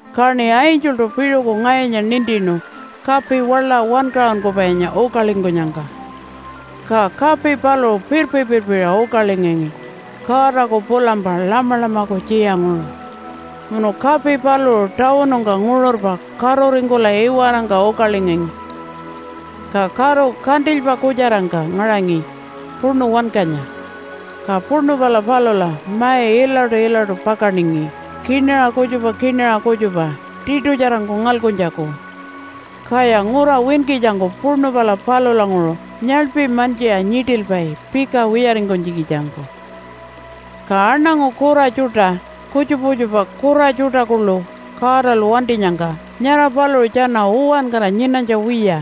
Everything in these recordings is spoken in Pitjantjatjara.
Kaṉi angeltu piṟuku ngayunya nintinu kapi waḻa wankaṟunkupainya ukalingkunyangka. Ka kapi paluṟu pirpi-pirpiṟa ukalingangi Godaku pulampa Lamalamaku tjiyanguṟu. Munu kapi paluṟu tawunungka nguṟurpa karuringkula iwarangka ukalingangi. Ka karu kantilypa kutjarangka ngaṟangi puṉu wankanya. Ka puṉu pala palula mai ilaṯu-ilaṯu pakaningi kinaṟa kutjupa kinaṟa kutjupa tiṯutjarangku ngalkuntjaku, kaya ngura winkitjangku puṉu pala palulanguṟu nyaḻpi mantjiṟa nyiṯilpai pika wiyaringkunytjikitjangku. Ka aṉangu kura tjuṯa kutjupa kutjupa kura tjuṯa kuḻu Godalu wantinyangka, nyara paluṟu tjana uwankara nyinanytja wiya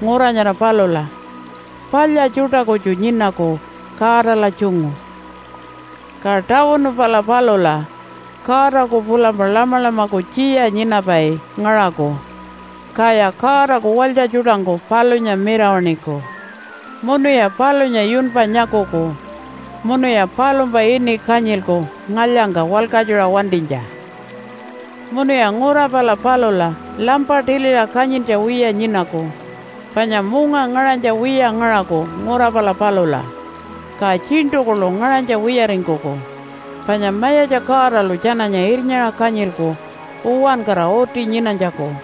ngura nyara palula, palya tjuṯa kutju nyinaku Godala tjungu. Ka tawunu pala palula Godaku pulampa Lamalamaku tjiya nyinapai ngaṟaku, kaya Godaku walytja tjuṯangku palunya mirawaṉiku. Munuya palunya yunpa nyakuku, munuya palumpa ini kanyilku ngalyangka walkatjuṟa wantinytja. Munuya ngura pala palula lampa tiliṟa kanyintja wiya nyinaku panya munga ngaṟanytja wiya ngaṟaku ngura pala palula. Ka tjiṉṯu kuḻu ngaṟanytja wiyaringkuku, panya Mayatja Godalu tjananya irnyaṟa kanyilku uwankara uti nyinanytjaku.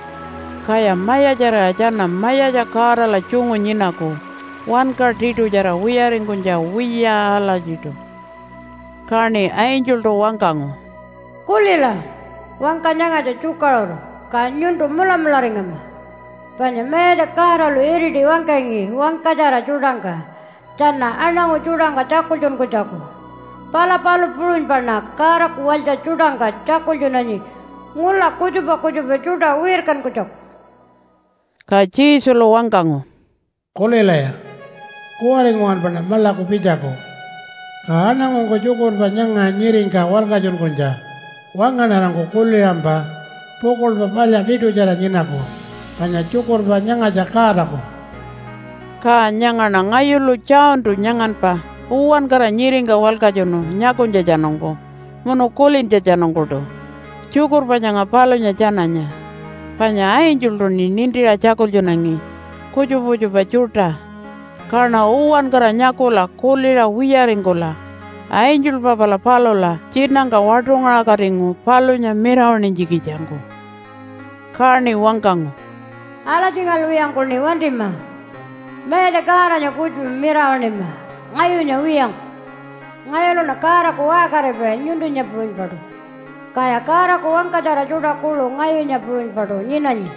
Kaya mayatjarira tjana Mayatja Godala tjungu nyinaku wanka tiṯutjara wiyaringkunytja wiya alatjiṯu. Kaṉi angeltu wangkangu, “Kulila, wangka nyangatja tjukaṟuru, ka nyuntu mulamularingama. Panya Mayatja Godalu iriti wangkangi wangkatjara tjuṯangka tjana aṉangu tjuṯangka tjakultjunkunytjaku, pala palu puṟunypaṉa Godaku walytja tjuṯangka tjakultjunanyi ngula kutjupa kutjupa tjuṯa wirkankunytjaku.” Ka Jesulu wangkangu, “Kulilaya! Kuwari nguwanpaṉa maḻaku pitjaku. Ka aṉangungku tjukurpa nyanga nyiringka walkatjunkunytja wangaṉarangku kuliṟampa pukuḻpa palya tiṯutjara nyinaku, panya tjukurpa nyangatja Godaku.” Ka nyangaṉa ngayulu Johntu nyanganpa uwankara nyiringka walkatjunu nyakunytjatjanungku munu kulintjatjanungkuṯu tjukurpa nyanga palunya tjananya. Panya angeltuṉi nintiṟa tjakultjunangi kutjupa kutjupa tjuṯa, kaṉa uwankara nyakula kuliṟa wiyaringkula angelpa pala palula tjinangka waṯungaṟakatingu palunya mirawaṉinytjikitjangku. Kaṉi wangkangu, “Alatjingalwiyangkuṉi wantima! Mayatja Godanya kutju mirawaṉima, ngayunya wiyangku! Ngayuluṉa Godaku waṟkaripai nyuntunya puṟunypaṯu. Kaya Godaku wangkatjara tjuṯa kuḻu ngayunya puṟunypaṯu nyinanyi.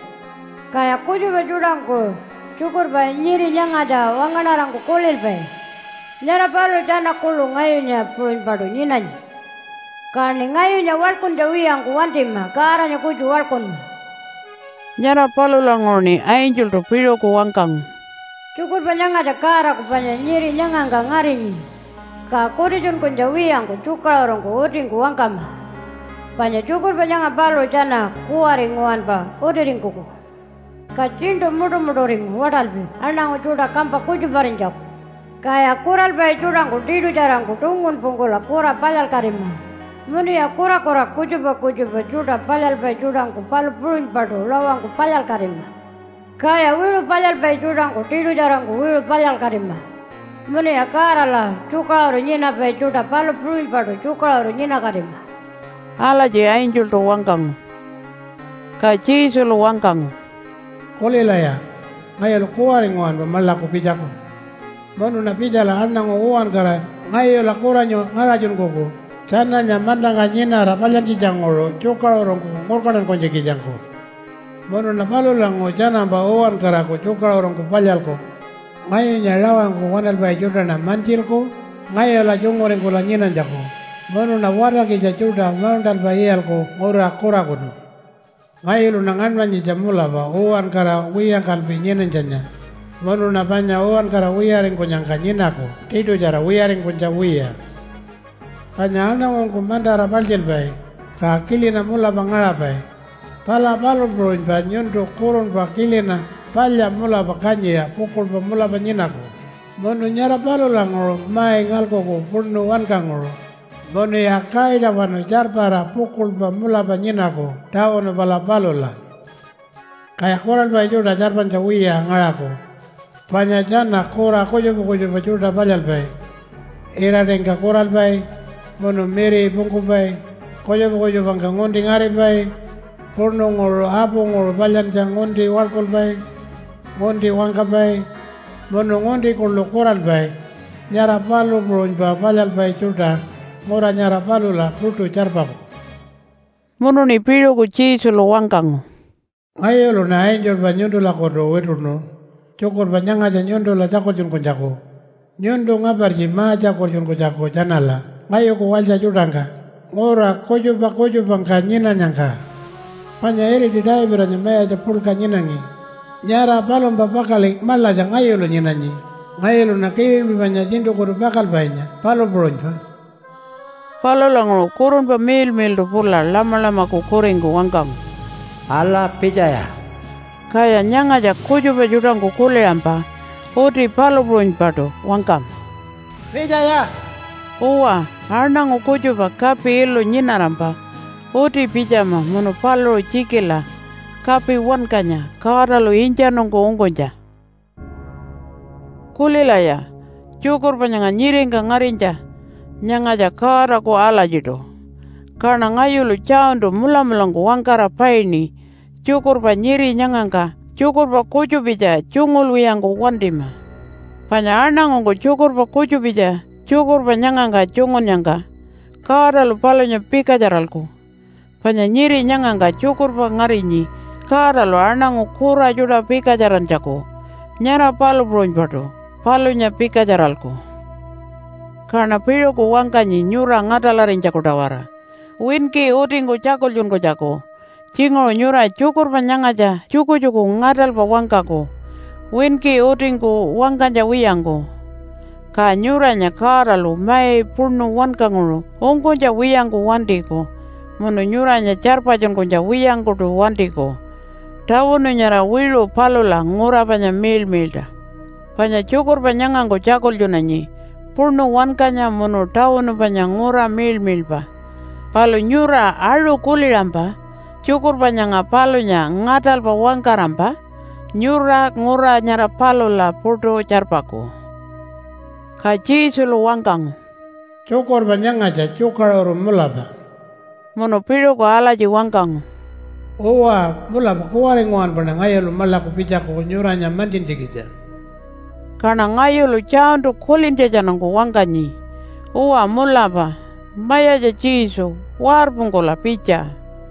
Kaya kutjupa tjuṯangku tjukurpa nyiri nyangatja wangaṉarangku kulilpai, nyara paluṟu tjana kuḻu ngayunya puṟunypaṯu nyinanyi. Kaṉi ngayunya waḻkuntja wiyangku wantima Godanya kutju waḻkunma!” Nyara palulanguṟuṉi angeltu piṟuku wangkangu, “Tjukurpa nyangatja Godaku panya nyiri nyangangka ngarinyi ka kutitjunkunytja wiyangku tjukaṟurungku utingku wangkama, panya tjukurpa nyanga paluṟu tjana kuwari nguwanpa utiringkuku. Ka tjiṉṯu muṯumuṯuringu waṯalpi aṉangu tjuṯa kampa kutjuparinytjaku. Kaya kuralpai tjuṯangku tiṯutjarangku tungunpungkula kura palyalkatima, munuya kurakura kutjupa kutjupa tjuṯa palyalpai tjuṯangku palu puṟunypaṯu rawangku palyalkatima. Kaya wiṟu palyalpai tjuṯangku tiṯutjarangku wiṟu palyalkatima, munuya Godala tjukaṟuru nyinapai tjuṯa palu puṟunypaṯu tjukaṟuru nyinakatima.” Alatji angeltu wangkangu. Ka Jesulu wangkangu, “Kulilaya! Ngayulu kuwari nguwanpa maḻaku pitjaku. Munuṉa pitjala aṉangu uwankara ngayula kuranyu ngaṟatjunkuku tjananya mantangka nyinara palyantjitjanguṟu tjukaṟurungku ngurkantankunytjikitjangku. Munuṉa palulanguṟu tjanampa uwankaraku tjukaṟurungku palyalku – ngayunya rawangku waṉalpai tjuṯaṉa mantjilku ngayula tjunguringkula nyinanytjaku, munuṉa watarkitja tjuṯa mauṉṯalpa iyalku ngura kurakutu. Ngayuluṉa ngaṉmanyitja mulapa uwankara wiyangkalpi nyinanytjanya, munuṉa panya uwankara wiyaringkunyangka nyinaku tiṯutjara wiyaringkunytja wiya. “Panya aṉangungku mantara paltjilpai ka kilina mulapa ngaṟapai, pala palu puṟunypa nyuntu kurunpa kilina palya mulapa kanyiṟa pukuḻpa mulapa nyinaku munu nyara palulanguṟu mai ngalkuku puṉu wankanguṟu munuya kaitawanu tjarpara pukuḻpa mulapa nyinaku tawunu pala palula. “Kaya kuralpai tjuṯa tjarpanytja wiya ngaṟaku, panya tjana kura kutjupa kutjupa tjuṯa palyalpai, iraṯingka kuralpai munu miripungkupai, kutjupa kutjupangka ngunti ngaripai, puṉunguṟu apunguṟu palyantja ngunti waḻkulpai, ngunti wangkapai munu ngunti kuḻu kuralpai, nyara palu puṟunypa palyalpai tjuṯa ngura nyara palula puṯu tjarpaku.” Munuṉi piṟuku Jesulu wangkangu, “Ngayuluṉa angelpa nyuntulakutu wituṉu tjukurpa nyangatja nyuntula tjakultjunkunytjaku nyuntu ngapartji ma-tjakultjunkunytjaku tjanala ngayuku walytja tjuṯangka ngura kutjupa kutjupangka nyinanyangka. Panya iriti Davidanya mayatja puḻka nyinangi, nyara palumpa pakaḻi maḻatja ngayulu nyinanyi. Ngayuluṉa kililpi panya tjiṉṯukutu pakalpainya, palu puṟunypa.” Palulanguṟu Kurunpa Miḻmiḻṯu pula Lamalamaku kuringku wangkangu, “Ala, pitjaya!” Kaya nyangatja kutjupa tjuṯangku kuliṟampa uti palu puṟunypaṯu wangkama, “Pitjaya!” Uwa, aṉangu kutjupa kapi ilu nyinarampa uti pitjama munu paluṟu tjikila kapi wankanya Godalu intjanungku ungkunytja. Kulilaya! Tjukurpa nyanga nyiringka ngarinytja nyangatja Godaku alatjiṯu. Kaṉa ngayulu Johntu mulamulangku wangkara paini tjukurpa nyiri nyangangka tjukurpa kutjupitja tjungulwiyangku wantima. Panya aṉangungku tjukurpa kutjupitja tjukurpa nyangangka tjungunnyangka Godalu palunya pikatjaralku, panya nyiri nyangangka tjukurpa ngarinyi Godalu aṉangu kura tjuṯa pikatjarantjaku, nyara palu puṟunypaṯu palunya pikatjaralku. Kaṉa piṟuku wangkanyi nyura ngaṯalarinytjaku-tawara winki utingku tjakultjunkunytjaku. Tjinguṟu nyura tjukurpa nyangatja tjukutjuku ngaṯalpa wangkaku winki utingku wangkanytja wiyangku, ka nyuranya Godalu mai puṉu wankanguṟu ungkunytja wiyangku wantiku munu nyuranya tjarpatjunkunytja wiyangkuṯu wantiku tawunu nyara wiṟu palula ngura panya miḻmiḻṯa. Panya tjukurpa nyangangku tjakultjunanyi puṉu wankanya munu tawunu panya ngura miḻmiḻpa, palu nyura aṟu kuliṟampa tjukurpa nyanga palunya ngaṯalpa wangkarampa nyura ngura nyara palula puṯu tjarpaku. Ka Jesulu wangkangu, “Tjukurpa nyangatja tjukaṟuru mulapa.” Munu piṟuku alatji wangkangu, “Uwa, mulapa kuwari nguwanpaṉa ngayulu maḻaku pitjaku nyuranya mantjintjikitja.” Kaṉa ngayulu Johntu kulintjatjanungku wangkanyi, “Uwa mulapa, Mayatja Jesu, warpungkula pitja.”